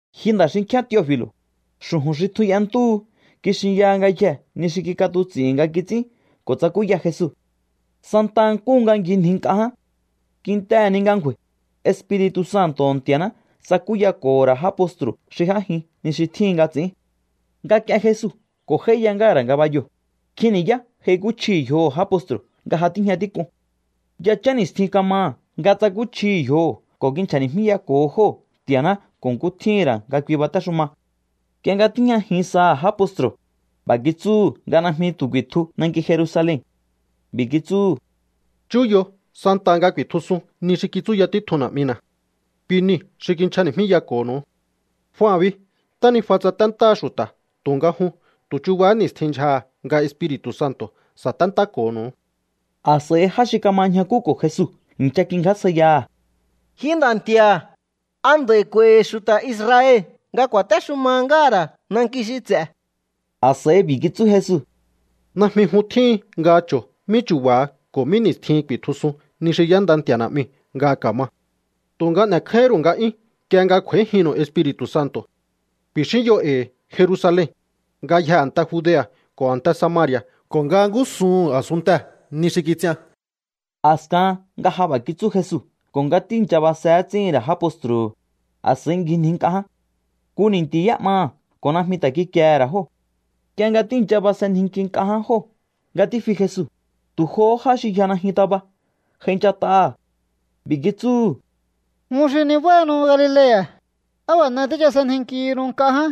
Ji nda̱ xinkjíán Teofi̱lo̱, xu̱ju̱n xi tjun y'entúhu kixinyaha ngayjee̱ ni xi kik'atuts'i̱hi̱n nga kits'ín ko̱ tsakúya Jesu santa nkúhu nga ngjinji nk'a ján. Kintehe̱ ni nga ngju̱a̱i̱, Espiri̱tu̱ Santo̱ho̱ Nti̱a̱ná tsakúyako̱ho̱ ra̱ já postru̱ xi j'ájin ni xi tjíhin nga ts'i̱ín. Nga k'ien Jesu ko̱ j'áíya ngáha̱ ra̱ ngabayoo̱, nkjin ni̱yá j'aikúchjihi̱ yjoho̱ já postru̱hu̱ nga ja tíjña tík'un. Yachán ni̱stjin kamaha̱ nga tsakúchjihi̱ yjoho̱ ko̱ kinchja̱ni̱jmíyako̱ho jóo̱ Nti̱a̱ná ko̱ nkú tjíhi̱n ra̱ nga kui batéxuma. Nk'ie nga tíjñajin saha̱ já postru̱, b'a̱ kitsúhu̱ nga najmi tu̱ ku̱i̱tju nanki Jerusalen. B'i̱ kitsúhu̱: —Chúyo santaha nga ku̱i̱tjusun ni xi kitsúya títjun Na̱'mina̱. Kui niu̱ xi kinchjani̱jmíyako̱ho̱nu̱u. Jua bi ntánijua tsaténtáha xu̱ta̱ tu̱nga jun tu̱ chuba ni̱stjihín ndyjaha̱ nga Espiri̱tu̱ Santo̱ sa̱téntáko̱ho̱nu̱u. A̱s'a̱i já xi kama ñjakúko̱ Jesu i̱ncha kingjásjaiyaha̱: —Ji Nda̱ Nti̱a̱, ¿a nd'a̱i̱ k'u̱a̱i̱hi̱ xu̱ta̱ Israel nga ku̱a̱téxuma ngáha̱ ra̱ nanki xi ts'e̱? A̱s'a̱i b'i̱ kitsú Jesu: —Najmi jun tjíhin nga cho̱o mí chu̱ba̱ha ko̱ mí ni̱stjihin ku̱i̱tjusun ni xi y'énda Nti̱a̱ Na̱'miu̱ nga ka̱ma. Tu̱nga n'e̱kjáíhín ru̱u nga'yún nk'ie nga kj'u̱a̱íjinnu̱u Espiri̱tu̱ Santo̱. Ku̱i̱xínyo e̱i̱ Jerusalen, ngayjee̱ a̱nte Judea̱ ko̱ a̱nte Samari̱a̱ ko̱ nga ngúsuhu̱n a̱sunntee̱ ni xi kits'ian. A̱skahan nga ja b'a̱ kitsú Jesu ko̱ nga tíi̱ncha base ts'íhi̱n ra̱ já postru̱hu̱, a̱s'a̱i ngjinji nk'a ján. Nku ni̱nti̱ y'é'maha̱ ko̱ najmi ta̱ kikiehe̱ ra̱ jóo̱. Nk'ie nga tíi̱ncha basenjinki nk'a ján jóo̱ nga tífi Jesu, tu̱ johó já xi yja najyun taba j'ainchat'aha̱. B'i̱ kitsúhu̱: —Jun xi nibáhanu Galilea̱, ¿á b'a̱ n'e tíchasenjinkihinu nk'a ján?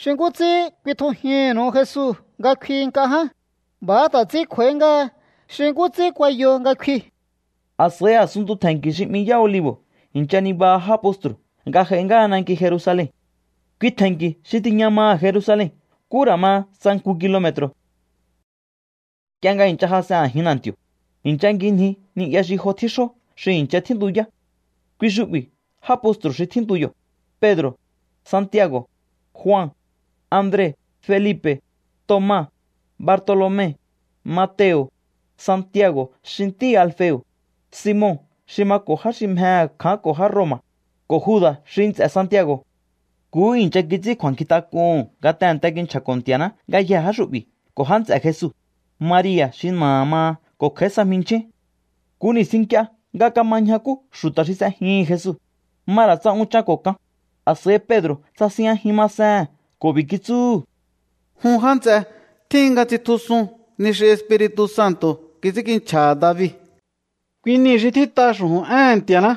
Xi nkú ts'ín kuitjujinnu̱u Jesu nga kfi nk'a ján, b'a̱há ta̱ ts'ín kj'u̱a̱í ngáha xi nkú ts'ín kuayo nga kfi. A̱s'a̱i a̱sunntu tje̱nki̱ xi 'mi Yá Olivo̱ i̱ncha nibaha já postru̱ nga j'ai ngáha nanki Jerusalen. Kui tje̱nki̱u̱ xi tiña maha̱ Jerusalen nkú ra̱ ma tsa nku kilome̱tru̱. Nk'ie nga i̱ncha jas'en a̱jin na̱nti̱o̱, i̱ncha ngjinji ni'ya xi jo tjíxjó xi i̱ncha tjíntuyá. Kui xu'bi̱ já postru̱ xi tjíntu yo̱: Pedro̱, Santiago̱, Jua, Andre, Felipe̱, Toma, Bartolome, Mateo̱, Santiago̱ xi ntíhi̱ Alfeo̱, Simon xi mako̱ já xi mjehe̱ kjaánko̱ já Roma̱, ko̱ Juda̱ xi nts'e̱ Santiago̱. Nkuhú i̱ncha kits'ín kju̱a̱nkjintak'uhu̱n nga tehe̱nte kinchja̱ko̱ Nti̱a̱ná ngayjee̱ já xu'bi̱ ko̱ já nts'e̱ Jesu, Maria̱ xi na̱aha̱ maha ko̱ kj'a̱í sa jminchjín. Nku ni̱stjin nk'ie nga kama ñjakú xu̱ta̱ xi s'ejihi̱n Jesu, ma ra̱ tsa unchan ko̱ kan, a̱s'a̱i Pedro̱ tsasinjñajin masehe̱n ko̱ b'i̱ kitsúhu̱: —Jun já nts'e, tjíhin nga tsitjusun ni xi Espiri̱tu̱ Santo̱ kits'ínkinchja̱ha̱ David. Kui niu̱ xi tjít'a xu̱ju̱n éhe̱n Nti̱a̱ná.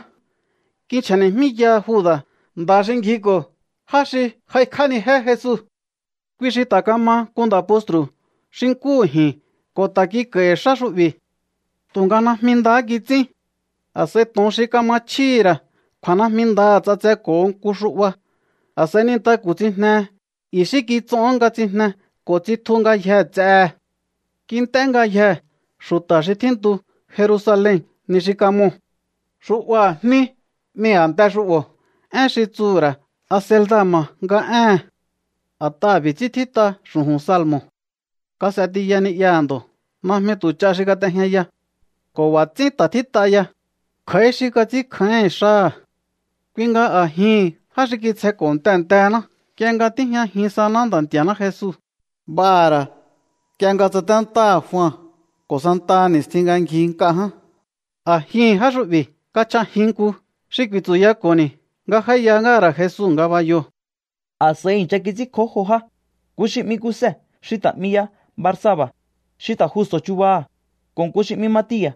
Kinchja̱ni̱jmíyaha Juda̱, nda̱ xi ngjiko̱ já xi j'aikj'ánijé Jesu. Kui xi ta̱ kama nku nda̱ postru̱ xi nkúhu ji̱n ko̱ ta̱ kik'a̱i̱hi̱ xá xu'bi̱. Tu̱nga najmi ndahá kits'ín. A̱s'a̱i to̱on xi kama chjíhi̱ ra̱ kju̱a̱ najmi ndaha̱ ts'atseko̱ho nku xu'ba. A̱s'a̱i nintaku̱ tsijnehe, i̱xí kits'ohón nga tsijne ko̱ tsitju ngayjee̱ ts'ehe̱. Kint'é ngayjee̱ xu̱ta̱ xi tjíntu Jerusalen ni xi kamoo̱. Xu'baha̱ Jní 'mi a̱nte xu'bo̱, én xi tsuhu̱ ra̱ Acelda̱ma̱ nga éhe̱n. A̱t'aha̱ b'i̱ ts'ín tjít'a xu̱ju̱n salmo̱: Kas'e tiya ni'yaha̱ ndo̱, najmi tu̱ ch'a xi kat'ejñaya. Ko̱ b'a̱ ts'ín ta̱ tjít'a ya: Kj'a̱í xi kats'ínkjáíhi̱n xáha̱. ’Kui nga a̱jihi̱n já xi kitsjenko̱ tehe̱ntehe̱ná nk'ie nga tíjñajin saná Nda̱ Nti̱a̱ná Jesu, b'aha̱ ra̱ nk'ie nga tsaténtáha̱ Jua ko̱ santaha ni̱stjin nga ngji nk'a ján, a̱jihi̱n já xu'bi̱ kachj'ajin nku xi ku̱i̱tsu̱yako̱ni̱ nga j'áíya ngáha̱ ra̱ Jesu ngabayoo̱. A̱s'a̱i i̱ncha kits'ínkjó jo já, nku xi 'mi Kuse xi ta̱ 'mi ya Barsaba, xi ta̱ Justo̱ chubaha̱, ko̱ nku xi 'mi Matia̱.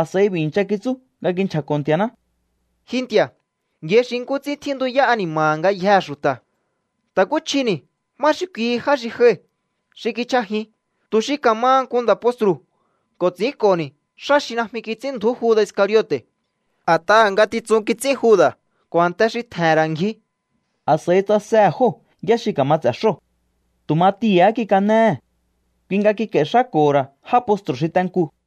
A̱s'a̱i b'i̱ i̱ncha kitsú nga kinchja̱ko̱ Nti̱a̱ná: —Ji Nti̱a̱, yai xi nkú ts'ín tjíntuyá ani̱ma̱ha̱ ngayjee̱ xu̱ta̱. Ta̱kúchjini̱ má xi kui já xi joi̱ xi kichj'ajin tu̱ xi ka̱maha nku nda̱ postru̱ ko̱ ts'i̱ínko̱ni̱ xá xi najmi kits'ínndju̱ú Juda̱ Iscariote̱. A̱t'aha̱ ngatitsun kits'ín Juda̱ ko̱ a̱nte xi tje̱he̱n ra̱ ngji. A̱s'a̱i tsasehe̱ jóo̱ yá xi ka̱ma ts'e̱ xóo̱. Tu̱ Matia̱há kikanéhe̱. Kui nga kik'a̱i̱ xáko̱ho̱ ra̱ já postru̱ xi te nkuu̱.